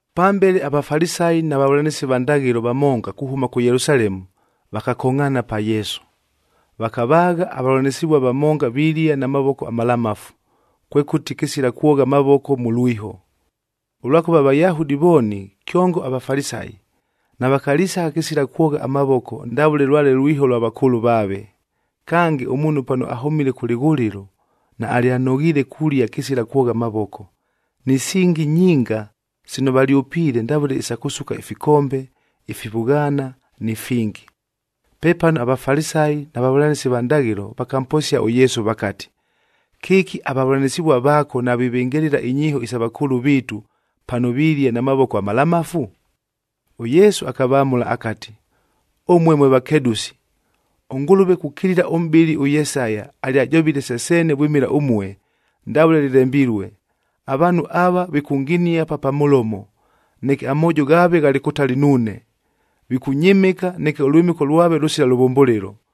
Pambele, aVafalisayi na vavʉlanɨsi va ndaghɨlo vamonga kuhʉma kʉ Yelusalemu vakakongʼhaana pa Yesu. Vakavaagha avavʉlanɨsɨvua vamonga vilia na mavoko amalamafu, kwekʉti kɨsila kwogha amavoko mʉ lwiho. Ʉlwakʉva aVayahudi vooni, kyongo aVafalisayi, navakalisagha kɨsila kwogha amavoko ndavʉle lwale lwiho lwa vakʉʉlʉ vaave. Kange, ʉmuunhu pano ahʉmile kʉ lɨghʉlɨlo, naalyanoghiile kulia kɨsila kwogha amavoko. Ni singi nyinga sino valyʉpiile, ndavʉle isa kʉsuka ifikombe, ifivʉghaana ni fingi. Pepano aVafalisayi na vavʉlanɨsi va ndaghɨlo vakamposia ʉYesu vakati, “Kɨki avavʉlanɨsɨvua vaako navivɨngɨlɨla inyiiho isa vakʉʉlʉ viitu, pano vilia na mavoko amalamafu?” ɄYesu akavamʉla akati, “Ʉmue mwe vakedʉsi! ɄNgʉlʉve kukilila ʉmʼbɨli ʉYesaya alyajovile se seene vwɨmɨla ʉmue, ndavʉle lɨlembilue, ‘Avaanhu ava vikʉnginia pa pa mʉlomo, neke amoojo ghaave ghalɨ kʉtali nuune. Vikʉnyɨmɨka, neke ʉlwɨmɨko lwave lʉsila lʉvʉmbʉlɨlo,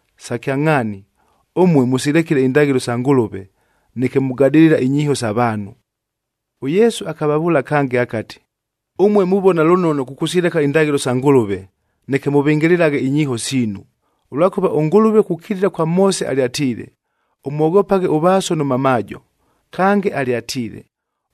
“Sa kyangʼhaani, ʉmue mʉsilekile indaghɨlo isa Ngʉlʉve, neke mugadɨlɨla inyiiho isa vaanhu.” ɄYesu akavavʉʉla kange akati, “Ʉmue muvona lʉnono kʉkʉsileka indaghɨlo sa Ngʉlʉve, neke mʉvɨngɨlɨlaghe inyiiho siinu! Ʉlwakʉva ʉNgʉlʉve kukilila kwa Moose alyatiile, ‘Ʉmwoghopaghe ʉvaaso nʉ mamaajo,’b kange alyatiile,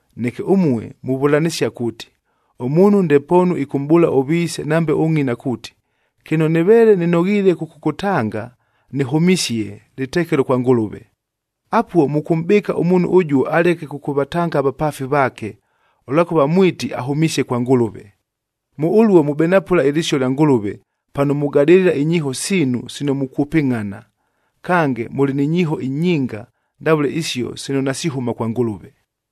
Neke ʉmue muvʉlanɨsia kuuti, ʉmuunhu ndepoonu ɨkʉmʼbʉʉla ʉviise nambe ʉngʼina kuuti, ‘Kɨno nɨveele nɨnoghiile kʉkʉkʉtanga, nɨhʉmisie, lɨtekelo kwa Ngʉlʉve.’ Apuo, mʉkʉmʼbɨɨka ʉmuunhu ʉjuo aleke kʉkʉvatanga avapaafi vaake, ʉlwakʉva mwiti ahʉmisie kwa Ngʉlʉve. Mʉ ʉluo mubenapʉla ɨlɨsio lya Ngʉlʉve, pano mugadɨlɨla inyiiho siinu sino mukwʉpɨngʼhana. Kange, mʉlɨ ni nyiiho inyinga ndavʉle isio sino nasihʉma kwa Ngʉlʉve.”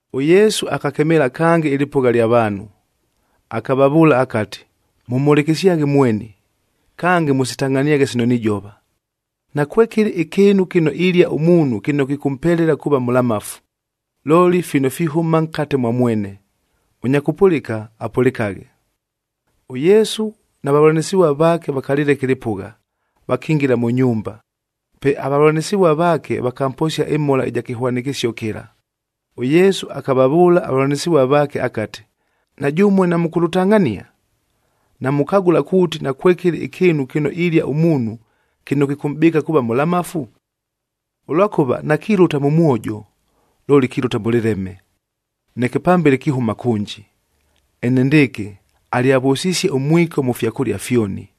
ɄYesu akakemeela kange ɨlɨpʉgha ɨlya vaanhu akavavʉʉla akati, “Mʉmhʉlɨkɨsyaghe mweni, kange mʉsitangʼhaniaghe sino nijova. Nakwekɨlɨ ɨkɨɨnu kɨno ilia ʉmuunhu kɨno kɨkʉmpelela kuuva mʉlamafu, looli fino fihʉma nkate mwa mwene. Ʉnya kʉpʉlɨka, ɄYesu na vavʉlanɨsɨvua vaake vakalɨleka ɨlɨpʉgha, vakingila mʉ nyumba. Pe avavʉlanɨsɨvua vaake vakamposia ɨmhola ɨja kɨhwanɨkɨsio kɨla. ɄYesu akavavʉʉla avavʉlanɨsɨvua vaake akati, “Na jʉmue namʉkʉlʉtangʼhania? Namukagʉla kuuti, nakwekɨlɨ ɨkɨɨnu kɨno ilia ʉmuunhu kɨno kɨkʉmʼbɨɨka kuuva mʉlamafu? Ʉlwakʉva nakilʉta mʉ mwojo, looli kilʉta mʉ lɨleme, neke pambele kihʉma kʉnji.” Enendɨɨkɨ, alyavʉsisie ʉmwiko mʉ fyakʉlia fyoni.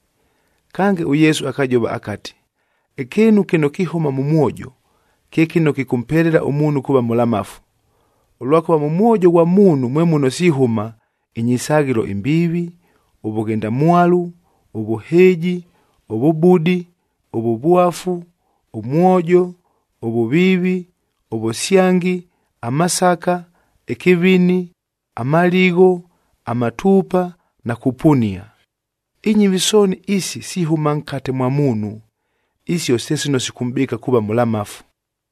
Kange ʉYesu akajova akati, “Ɨkɨɨnu kɨno kihʉma mʉ mwojo, kye kɨno kɨkʉmpelela ʉmuunhu kuuva mʉlamafu. Ʉlwakʉva mʉ mwojo ghwa muunhu mwe muno sihʉma: inyisaghɨlo imbiivi, ʉvʉghendamwalu, ʉvʉhɨɨji, ʉvʉbudi, ʉvʉvwafu, ʉmwojo, ʉvʉviivi, ʉvʉsyangi, amasaka, ɨkɨvini, amaligho, amatuupa na kupunia. Inyɨvi sooni isi sihʉma nkate mwa muunhu, isio se sino sikʉmʼbɨɨka kuuva mʉlamafu.”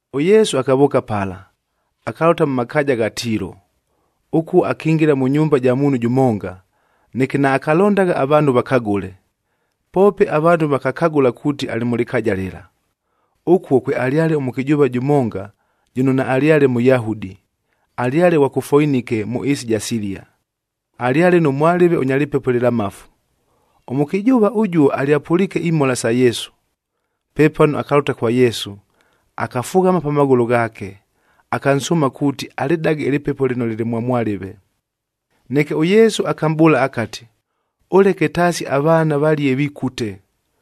ɄYesu akavʉʉka pala, akalʉta mʉ makaaja gha Tiilo.e Ʉkuo akingila mʉ nyumba ja muunhu jʉmonga, neke naakalondagha avaanhu vakagʉle. Poope avaanhu vakakagʉla kuuti alɨ mʉ lɨkaaja lɨla. Ʉkuo kwealyale ʉmʉkɨjʉʉva jʉmonga jʉno naalyale Mʉyahudi, alyale ghwa kʉ Foinike mʉ ɨɨsi ɨja Silia, alyale nʉ mwalɨve ʉnya lɨpepo ɨlɨlamafu. Ʉmʉkɨjʉʉva ʉjuo alyapʉliike imhola sa Yesu. Pepano akalʉta kwa Yesu, akafughama pa maghʉlʉ ghaake, akansʉʉma kuuti alɨdage ɨlɨpepo lɨno lɨlɨ mwa mwalɨve. Neke ʉYesu akamʼbʉʉla akati, “Ʉleke taasi avaana valie vikute,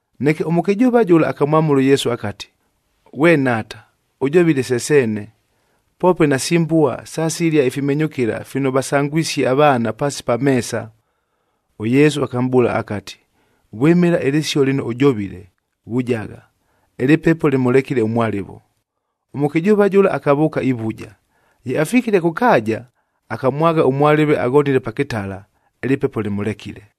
Neke ʉmʉkɨjʉʉva jʉla akamwamʉla ʉYesu akati, “Ghwe Nhaata, ʉjovile se seene, poope nasi mbua sasilia ifimenyʉkɨla fino vasangwisie avaana paasi pa meesa.” ɄYesu akamʼbʉʉla akati, “Vwɨmɨla ɨlɨsio lɨno ʉjovile, vujagha, ɨlɨpepo lɨmʉlekile ʉmwalɨvo.” Ʉmʉkɨjʉʉva jʉla akavʉʉka ivuja. Ye afikile kʉ kaaja, akamwagha ʉmwalɨve aghonile pa kɨtala, ɨlɨpepo lɨmʉlekile.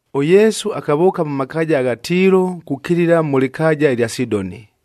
ɄYesu akavʉʉka mʉ makaaja agha Tiilo kukilila mʉ lɨkaaja ɨlya Sidoni,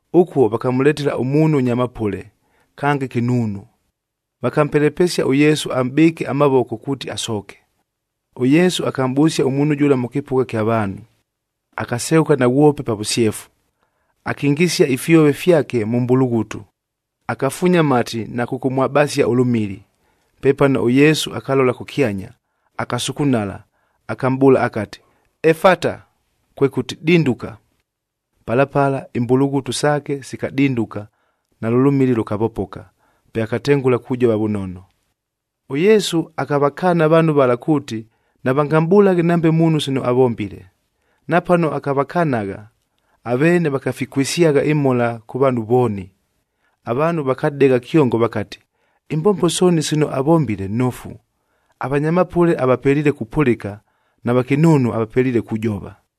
Ʉkuo vakamʉletela ʉmuunhu ʉnya mapʉle, kange kɨnuunu. Vakampelepesia ʉYesu amʼbɨɨke amavoko kuuti asooke. ɄYesu akamʼbʉsia ʉmuunhu jʉla mʉ kɨpʉgha ɨkya vaanhu, akaseghʉka naghwope pa vʉsyefu, akingisia ifyove fyake mʉ mbulughutu, akafuunya amati na kʉkʉmwabasia ʉlʉmili. Pepano ʉYesu akalola kʉkyanya, akasukunala, akamʼbʉʉla akati, “Efata,” kwekʉti, “Dinduka.” Pala pala imbulughutu saake sikadinduka nalʉ lʉmili lʉkavopoka, pe akatengʉla kujova vʉnono. ɄYesu akavakaana avaanhu vala kuuti, navangamʼbʉlaghe nambe muunhu sino avombile. Napano akavakanagha, aveene vakafikwɨsyagha ɨmhola kʉ vaanhu vooni. Avaanhu vakadegha kyongo vakati, “Imbombo sooni sino avombile nofu! Avanya mapʉle avapeliile kupʉlɨka na vakɨnuunu avapeliile kujova.”